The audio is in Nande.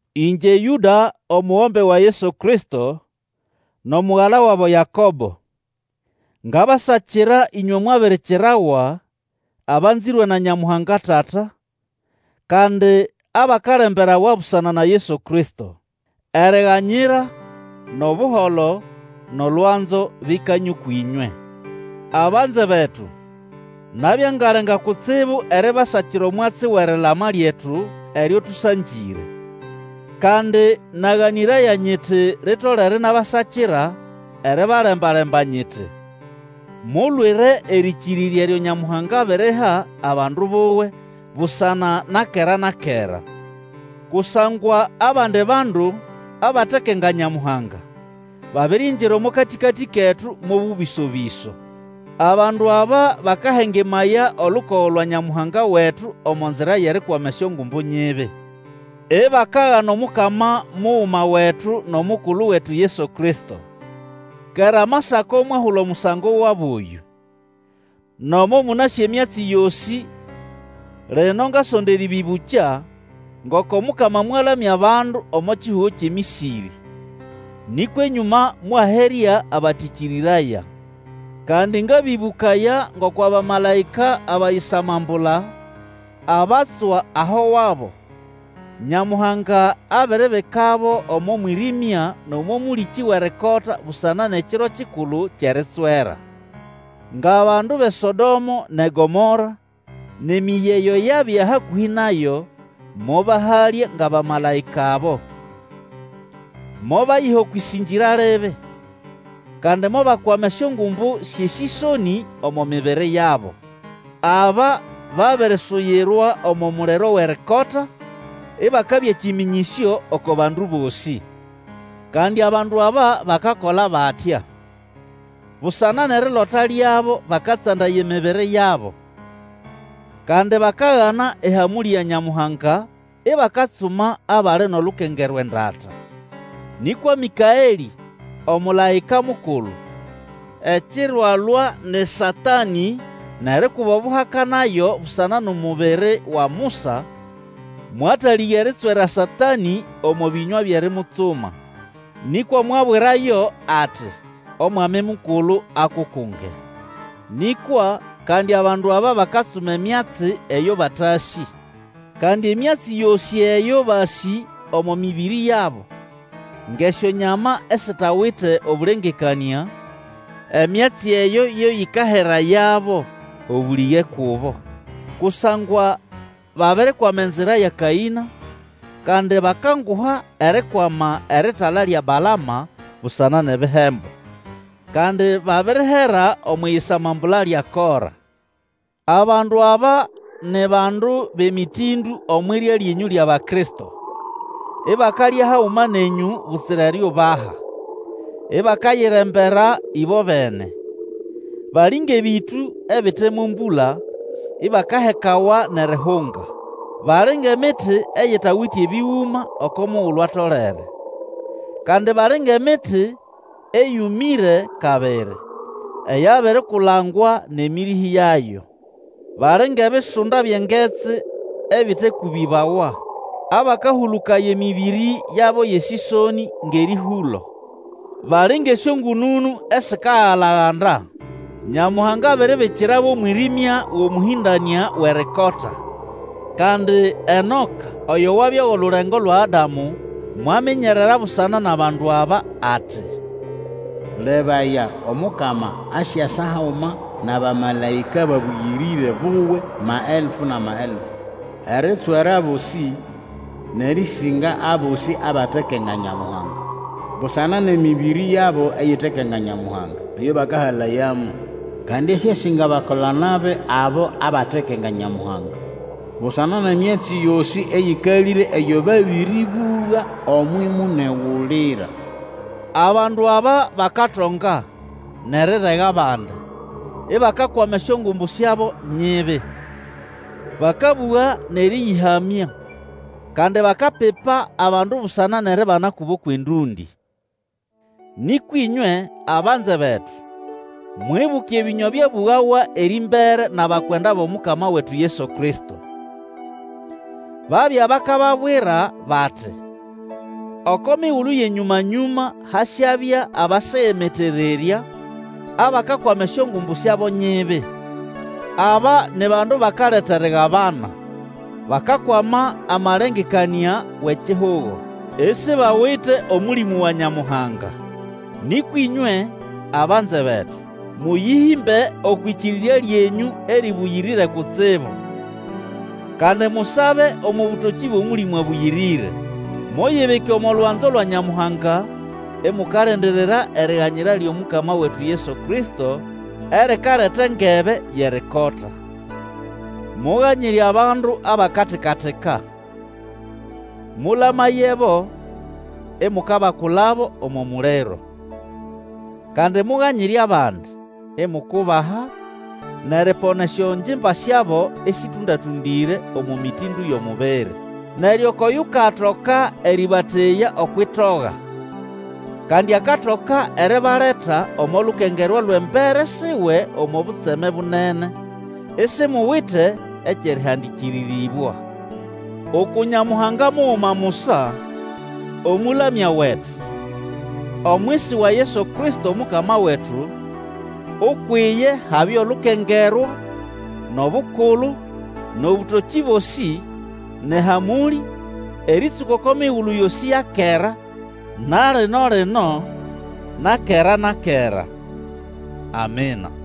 Ĩngye Yũda, omugombe wa Yesu Kristo, nʼomugala wabo Yakobo, ngabasakira ĩnywe mwabirikirawa, abanzĩrwe na Nyamuhanga Tata, kandi abakalemberawa busana na Yesu Kristo. Eriganyira, nʼobuholo, nʼolwanzo bikanye ũkwʼĩnywe. Abanze betu, nabya ngalenga kutsibu eribasakira omwatsi wʼerilama lyetu eryo tũsangĩre. Kandi naganĩraya nyiti litolere inabasakira eribalemba-lemba nyiti, Mulwire erĩkĩrĩrya eryo Nyamuhanga abiriha abandu buwe busana na kera na kera. Kusangwa abandi bandu, abatekenga Nyamuhanga, babiringira omo katĩkatĩ ketu mo bũbĩso-bĩso. Abandu aba bakahengemaya olukogo lwa Nyamuhanga wetu omo nzira yʼerikwama esyongumbu nyibi, ibakagana Omukama muguma wetu nʼomukulu wetu Yesu Kristo. Kera Amasako mwahula omusango wabo oyũ. Nomo mũnasĩ emyatsi yosĩ, lino ngasonda erĩbĩbũkya, ngoko Mukama mwalamya bandu omo kihugo kyʼeMĩsĩrĩ, nĩkwa enyũma mwaherya abatĩkĩrĩraya. Kandi ngabĩbũkaya ngoko abamalaĩka abayisamambula, abatswa aho wabo, Nyamuhanga abiribikabo omo mwĩrĩmya nʼomo mũlĩkĩ Wʼerikota busana nʼEkiro kikulu kyʼeritswera. Ngʼabandu bʼeSodomo nʼeGomora, nʼemĩyĩ eyo yabya hakũhĩ nayo, mobahalya ngʼabamalaĩka abo. Mobayiha okwʼĩsĩngĩra libi, kandi mobakwama esyongumbu syʼesĩsonĩ omo mibiri yabo. Aba babirisuyirwa omo muliro Wʼerikota, ibakabya kĩmĩnyĩsyo oko bandu bosĩ. Kandi abandu aba bakakola batya. Busana nʼerilota lyabo bakatsandaya emibiri yabo. Kandi bakagana ehamũlĩ ya Nyamuhanga, ibakatsuma abali nʼolukengerwa endata. Nĩkwa Mĩkaelĩ omũlaĩka mukulu, ekiro alwa nʼeSatanĩ nʼerikuba obuhaka nayo busana nʼomubiri wa Musa, mwatalĩga eritswera Satanĩ omo bĩnywa byʼerimutsuma, nĩkwa mwabwirayo ati, Omwami Mukulu akukunge. Nĩkwa kandi abandu aba bakatsuma emyatsi eyo batasĩ. Kandi emyatsi yosĩ eyo basĩ omo mĩbĩrĩ yabo, ngʼesyonyama esitawite obũlengekanĩa, emyatsi eyo yo yĩkaherayabo. Obũlĩge kubo! Kusangwa babirikwama enzira ya Kaĩna, kandi bakanguha erikwama eritala lya Balama busana nʼebihembo, kandi babirihera omwʼiyisamambula lya Kora. Abandu aba ni bandu bʼemĩtĩndũ omwʼirya lyenyũ lyʼAbakristo, ibakalya haguma nenyũ butsira eriubaha, ibakayirembera ĩbobene. Bali ngʼebĩtũ ebite mo mbũla, ibakahekawa nʼerihunga. Bali ngʼemiti eyitawite ebĩgũma oko mugulu atolere. Kandi bali ngʼemiti eyũmĩre kabiri, eyabirikulangwa nʼemĩrĩhĩ yayo. Bali ngʼebisunda byʼengetsi ebitekũbĩbawa, abakahũlũkaya emĩbĩrĩ yabo yʼesĩsonĩ ngʼerĩhũlo. Bali ngʼesyongũnũnũ esikagalaganda. Nyamuhanga abiribikirabo omwĩrĩmya wʼomũhĩndanĩa Wʼerikota. Kandi Enoka oyo wabya wʼolulengo lwa Adamu, mwaminyerera busana nʼabandu aba ati, Lebaya, Omukama asyasa haguma nʼabamalaĩka babũyĩrĩre buwe maelfu nʼamaelfu, eritswera abosĩ, nʼerĩsĩnga abosĩ abatekenga Nyamuhanga busana nʼemĩbĩrĩ yabo eyitekenga Nyamuhanga, eyo bakahalayamo, kandi asyasĩnga abakola-nabi abo abatekenga Nyamuhanga busana nʼemyatsi yosĩ eyĩkalĩre eyo babĩrĩbũga omwʼimunegulira. Abandu aba bakatonga, nʼerirega abandi, ibakakwama esyongumbu syabo nyibi. Bakabũga nʼerĩyĩhamya, kandi bakapipa abandu busana nʼeribana kubo kwʼendũndĩ. Nĩkwa ĩnywe, abanze betu, mwibuke ebĩnywa byabũgawa erĩmbere nʼabakwenda bʼOmukama wetu Yesu Kristo. Babya bakababwira bati, Oko migulu yʼenyũma-nyũma hasyabya abasegemetererya, abakakwama esyongumbu syabo nyibi. Aba ni bandu bakaleta erigabana, bakakwama amalengekanĩa wʼekihugo, isibawite Omũlĩmũ wa Nyamuhanga. Nĩkwa ĩnywe, abanze betu, mũyĩhĩmbe okwʼĩkĩrĩrya lyenyũ erĩbũyĩrĩre kutsibu; kandi musabe omo bũtokĩ bwʼOmũlĩmũ Abũyĩrĩre. Muyibike omo lwanzo lwa Nyamuhanga, imukalindirira eriganyira lyʼomukama wetu Yesu Kristo, erikaleta engebe yʼerikota. Muganyire abandu abakatika-tika. Mũlayebo, imukabakulabo omo muliro. Kandi muganyire abandi, imukubaha, nʼeripona esyongimba syabo esĩtũnda-tũndĩre omo mĩtĩndũ yʼomubiri. Neryo ukwʼoyukatoka erĩbateya okwʼitoga, kandi akatoka eribaleta omo lukengerwa lwʼembere siwe omo butseme bunene, isimuwite ekyʼerĩhandĩkĩrĩrĩbwa. Uku Nyamuhanga muguma musa, Omũlamya wetu, omwisi wa Yesu Kristo Omukama wetu, ukwʼiye habye olukengerwa, nʼobukulu, nʼobũtokĩ bosĩ, nʼehamũlĩ, erĩtsũka oko migulu yosĩ ya kera, na lino-lino, na kera na kera. Amina.